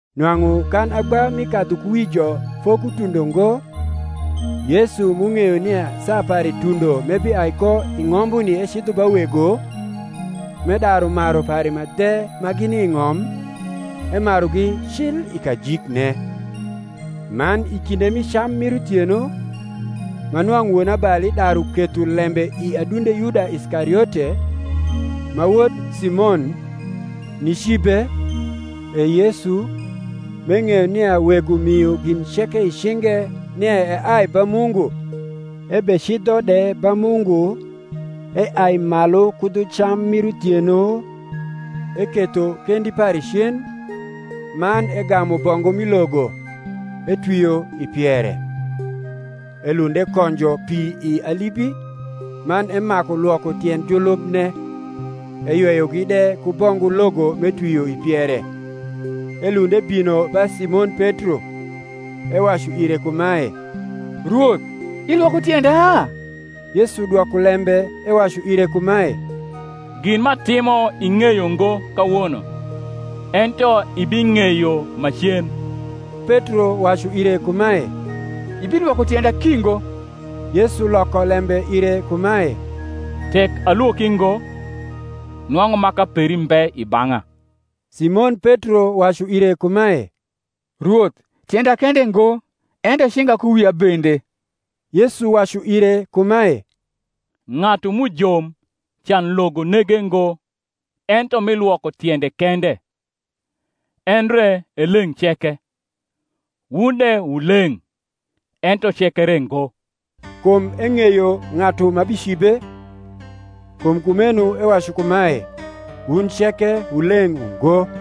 Nwang’u kan agba mi kadhukuwijo fokutundo ngo, Yesu m’ung’eyo nia saa pare tundo m’ebiai ko i ng’ombuni ecidho ba Wego, m’edaru maru pare ma dhe ma gini i ng’om, emarugi cil i kajikne. Man i kinde mi cam mir uthieno, ma nwang’u wonabali daru ketho lembe i adunde Yuda Iskariote, ma wod Simon, nicibe, e Yesu, m’eng’eyo nia Wego mio gin ceke i cinge nia eai ba Mungu, ebecidho de ba Mungu, eai malu ku dhu cam mir uthieno, eketho kendi pare cen; man egamu bongu mi logo, etwio i piere. Elund ekonjo pi i alibi, man emaku lwoko tiend julubne, eyweyogi de ku bongu logo m’etwio i piere. Elund ebino ba Simon Petro; Ewacu ire kumae, Rwoth, ilwoko tienda? Yesu dwoko lembe ewacu ire kumae, Gin m’atimo ing’eyo ngo kawono; ento ibing’eyo macen. Petro wacu ire kumae, Ibilwoko tienda ki ngo. Yesu loko lembe ire kumae, Tek alwoki ngo, nwang’u maka peri mbe i bang’a. Simon Petro wacu ire kumae, Rwoth, tienda kende ngo, ento cinga ku wia bende. Yesu wacu ire kumae, Ng’atu m’ujom can logo nege ngo ento mi lwoko tiende kende, endre e leng’ ceke; wun de wu leng’, ento ceke re ngo. Kum eng’eyo ng’atu ma bicibe; kum kumeno ewacu kumae, Wun ceke wu leng’ ungo.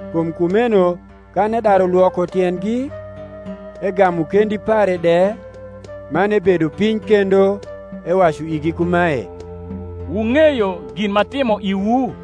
Kum kumeno kan edaru lwoko tiendgi, egamu kendi pare de, man ebedo piny kendo, ewacu igi kumae, Wung’eyo gin m’atimo iwu?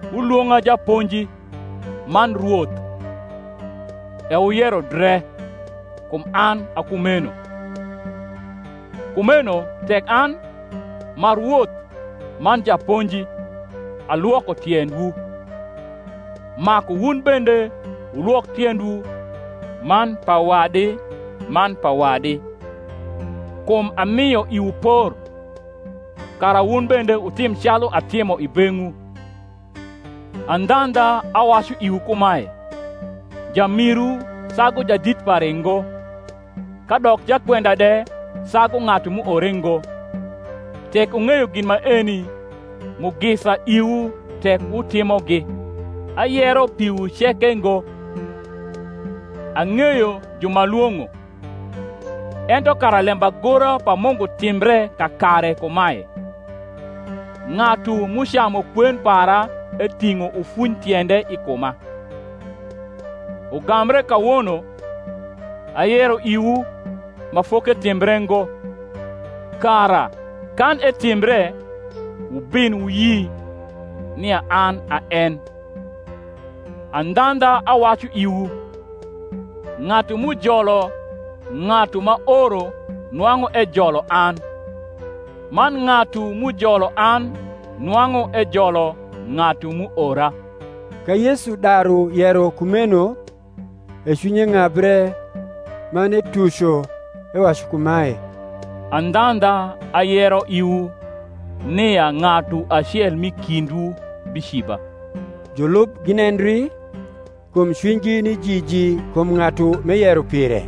Wulwong’a Japonji, man Rwoth: e wuyero dre; kum an a kumeno. Kumeno tek an, m’a Rwoth man Japonji, alwoko tiendwu, maku wun bende wulwok tiendwu man pa wadi man pa wadi. Kum amio iwu por, kara wun bende wutim calu atimo i beng’wu. Andhandha, awacu iwu kumae, Jamiru sagu jadit pare ngo; kadok jakwenda de sagu ng’atu m’uore ngo. Tek wung’eyo gin maeni, mugisa iwu tek wutimogi. Ayero piwu ceke ngo; ang’eyo ju m’alwong’o: ento kara lembagora pa Mungu timbre kakare kumae, Ng’atu m’ucamu kwen para eting’o ufunytiende i kuma. Ugambre kawono ayero iwu ma foketimbre ngo, kara, kan etimbre, wubin wuyi nia an a en. Andhandha, awacu iwu, ng’atu m’ujolo ng’atu m’aoro nwang’u ejolo an; man ng’atu m’ujolo an nwang’u ejolo ng’atu m’uora. Ka Yesu daru yero kumeno, e cwinye ng’abre, man etuco, ewacu kumae, Andhandha, ayero iwu, nia ng’atu acel m’i kindwu biciba. Julub ginendri, kum cwinygi ni jiji kum ng’atu m’eyero pire.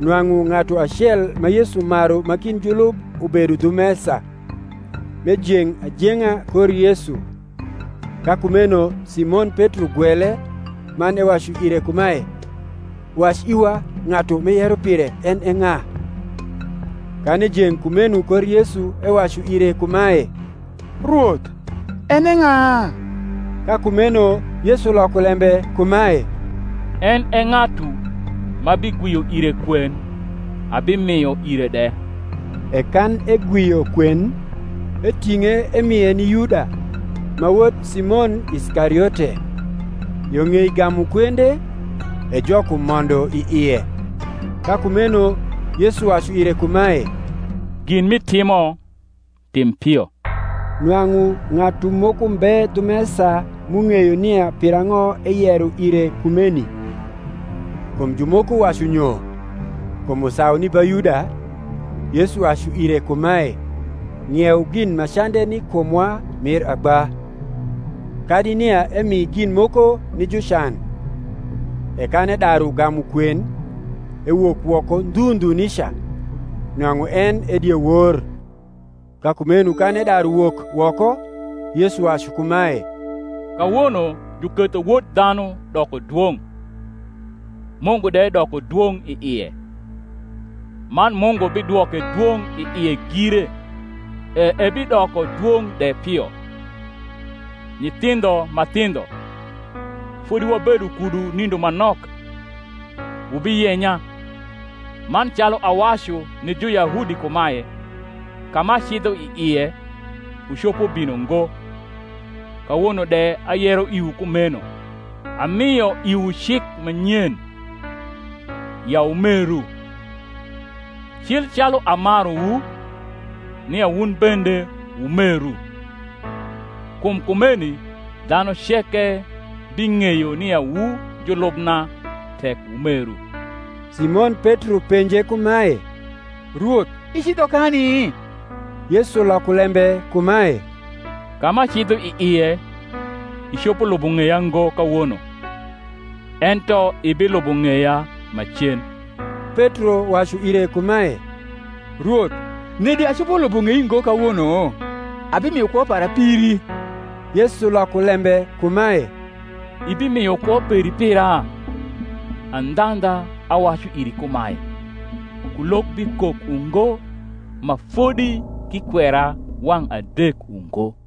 Nwang’u ng’atu acel ma Yesu maru ma kind julub ubedo dhu mesa, m’ejeng’ ajeng’a kor Yesu. Ka kumeno Simon Petro gwele, man ewacu ire kumae, Wac iwa ng’atu m’eyero pire en e ng’a. Kan ejeng’ kumeno kor Yesu ewacu ire kumae, Rwoth, en e ng’a? Ka kumeno Yesu loko lembe kumae, En e ng’atu, m’abigwio ire kwen, abimio ire de. E kan egwio kwen, eting’e emie ni Yuda, ma wod Simon Iskariote. Yo ng’ei gamu kwende, e Jok umondo i ie. Ka kumeno Yesu wacu ire kumae, Gin m’itimo, tim pio. Nwang’u ng’atu moko mbe dhu mesa m’ung’eyo nia pirang’o eyero ire kumeni. Kum jumoko wacu nyo, kum usau ni ba Yuda, Yesu wacu ire kumae, Ng’ieu gin ma cande ni kumwa mir agba; kadi nia emi gin moko ni jucan. E kan edaru gamu kwen, ewok woko ndhu ndhu nica: nwang’u en e diewor. Ka kumeno kan edaru wok woko, Yesu wacu kumae, Kawono juketho Wod dhanu doko dwong’, Mungu de doko dwong’ i ie; man Mungu bidwoke dwong’ i ie gire, e ebidoko dwong’ de pio. Nyithindho ma thindho, fodi wabedo kudu nindo ma nok. Wubiyenya: man calu awacu ni Juyahudi kumae, Ka m’acidho i ie, wucopo bino ngo; kawono de ayero iwu kumeno. Amio iwu cik ma nyen, ya wumeru; cil calu amaruwu, nia wun bende wumeru. Kum kumeni dhanu ceke bing’eyo nia wu julubna tek wumeru. Simon Petro penje kumae, Rwoth, icidho kani? Yesu loko lembe kumae, Ka m’acidho i ie, icopo lubo ng’eya ngo kawono; ento ibilubo ng’eya macen. Petro wacu ire kumae, Rwoth, nedi acopo lubo ng’ei ngo kawono? Abimio kwo para piri. Yesu loko lembe kumae, Ibimio kwo peri pira? Andhandha, awacu iri kumae, Kulok bikok ungo, ma fodi k’ikwera wang’ adek ungo.